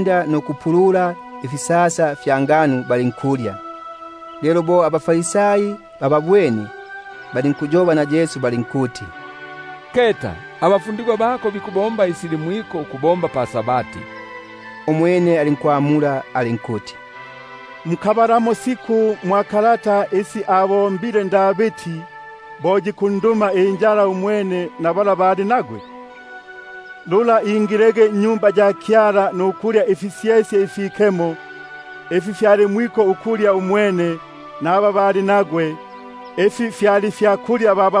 nda ukupulula ifisasa fya ngano, balinkulya. Lelo bo abaFarisai bababwene, balinkumbula balinkuti: Keta, abafundigwa bako bikubomba isi sili mwiko ukubomba pa-Sabati. Umwene alinkubabula alinkuti: Mukabalamo siku sila abo- mbege Davidi, bo ali ninjala na bala bali nagwe? Apa ingilege nnyumba ya Kyala, pala alyege ifisyesye ifikemesigwa, ifi fyali mwiko ukulya yuyo naba bali nagwe, loli bene ba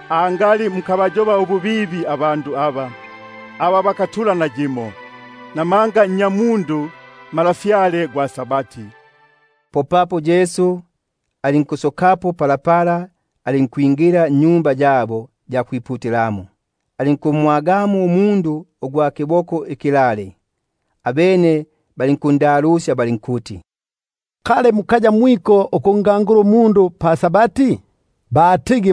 angali mukabayoba ububibi abasitanongwa. Namanga Nnyamundu yo Malafyale gwa Sabati. Popapo alinkusokapo, alinkwakwingila mu-Sinagogi yabo. Lelo alipo umundu ugwa kiboko ikilale; balinkundalusya balinkuti: Kali kubagile ukubumbulusya pa-Sabati? Batigi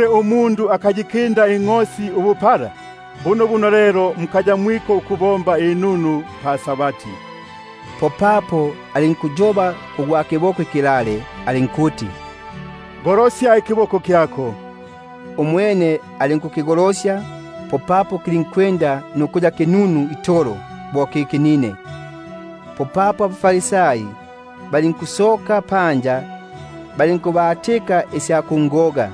Umundu akayikinda ingʼosi ubupala lelo! Bunobuno kuba- gile ukusibomba inunu pa-Sabati. Popapo alinkumbula umundu yula alinkuti: Golosya ikiboko kyako. Umwene alinkukigolosya, popapo lulinkuya kinunu itolo bo ikinine. AbaFarisai balinkusoka panja, balinkukomana nukuyobana isya kungogelamo.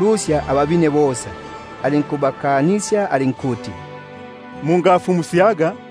lusya bosa. Alinkubakanisya ukuti bangamfumusyaga;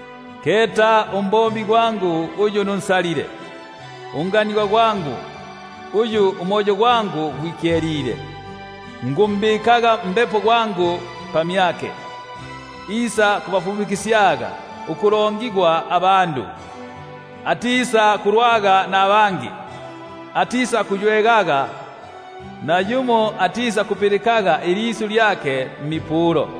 Keta umbombi gwangu uyu nunsalile, Unkundwe kumyangu, muli uyu umoyo gwangu gwikyelile; Yo nisakumbikapo Mbepo gwangu pamyake, Isakubafumukisyaga ubwanaloli abapanja. Umwene atisakulwaga, kangi atisakuywegaga, Nayumo atisakupilikaga ilisyu iyake mmipulo.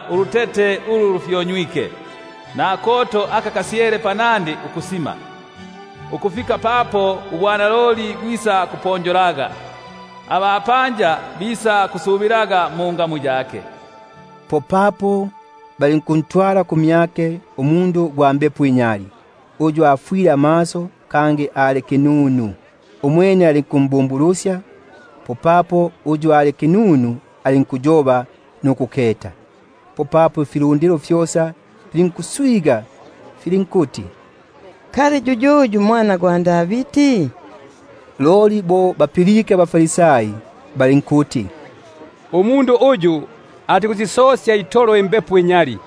Ulutete ulu lufyonywike atisakulukonyolaga, Nakoto aka kalotile atisakukasimisyaga, Ukufika papo isakubupelaga ubwanaloli ukuya buponjoli; Kangi abapanja bisakusubilaga mungamu yake. Popapo balinkuntwalila umundu ugwa mbepo inyali, uyu afwile amaso kangi ali kinunu; umwene alinkumbumbulusya, bunobuno uyu ali kinunu alinkuyoba nukuketa. Popapo ifilundilo fyosa Alinkuswiganika, filinkuyoba filinkuti: Kali yuyuyu yo yu nnya Davidi? Loli abaFarisai bo bapilike, balinkuyoba balinkuti: Umundu uyu atikusisosya itolo imbepo inyali, loli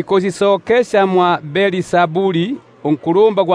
ikusisokesya mwa Belzebuli unkulumba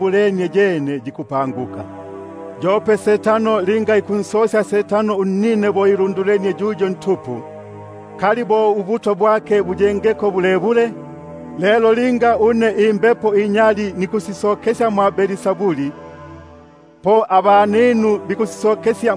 lenie, fikabagila ukuyako. Yope na Setano linga ikunsosya Setano unnine, bo ilundulenie yuyo ntupu; lelo ubutwa bwake buyengeko bulebule? Lelo linga une nikusisokesya imbepo inyali mwa Belzebuli, po abaninu bikusisokesya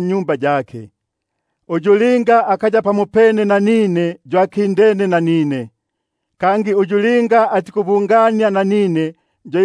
nnyumba yake. Uyu linga akaya pamopene nanine, yo akindene nanine; kangi uyu linga atikubungania nanine, yo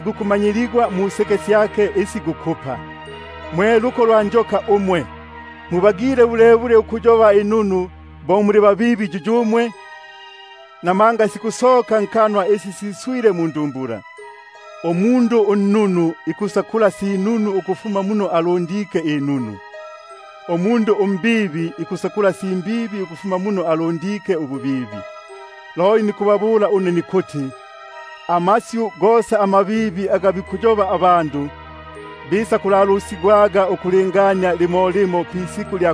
gukumanyigwa museke syake. Mwe luko lwa njoka umwe, mubagile bulebule ukuyoba inunu bo muli babibi? Namanga isi sikulefuka mundumbula, syo isi sikusoka nkanwa. Umundu unnunu ikusakula si nunu muno alundike ubununu; umwene umundu umbibi ikusakula si mbibi muno alundike ububibi. Loli nikubabula nikuti, ilisyu lyosa ilibibi ili bikuyobaga abandu, bisakulalusigwaga ukulingania limo limo pisiku lya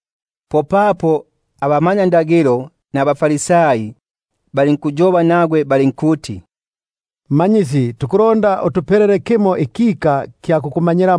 Popapo bamo abamanyakalata nabaFarisai balinkumwamula balinkuti: Mmanyisi, tukulonda ukuketa kimo ikika ukufuma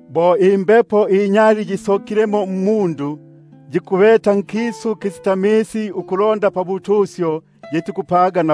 Apa linga imbepo inyali yikusokamo mmundu, yikukisania mbuyo ubusitamisi ukulonda ubutusyo, loli yitikubwaga.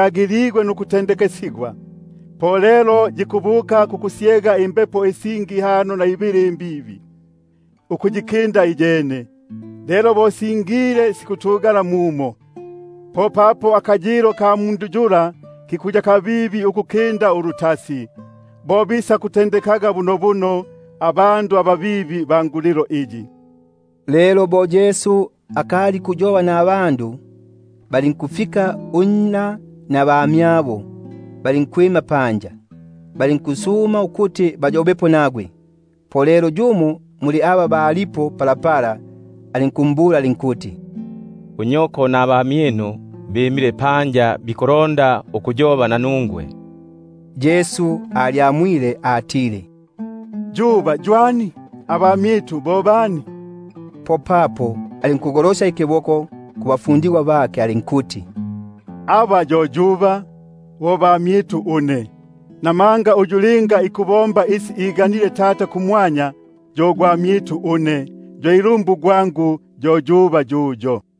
giligwe nukunosigwa. Po yikubuka nukwakusyega imbepo isingi ihano na ibili imbibi nukuyikinda iyene; lelo bo singile sikutugala mumo; popapo akayilo ka mundu yula aka kunyuma kikuya kabibi ukukinda aka kwanda. Bo sikuyaga bunobuno kungulilo imbibi iyi. Lelo bo akali ali pakuyoba kufilundilo, unna nabamyabo balyimile panja, balondaga ukuyoba nagwe. [Yumo alinkumbula alinkuti: Keta, unyoko nabamyinu bimile panja, bikulonda ukuyoba nanungwe.] Popapo alinkumwamula uyu ambulaga alinkuti: Yuba yo aliku, nabamyitu bo baliku? Popapo alinkugolosya ikiboko kubafundigwa bake alinkuti: Keta, yuba nabamyitu! Namanga gwesa uyu linga ikubomba ubwigane bwa Tata uyu ali kumwanya, yo nnuguna gwangu, yo ilumbu gwangu, kangi yo yuba.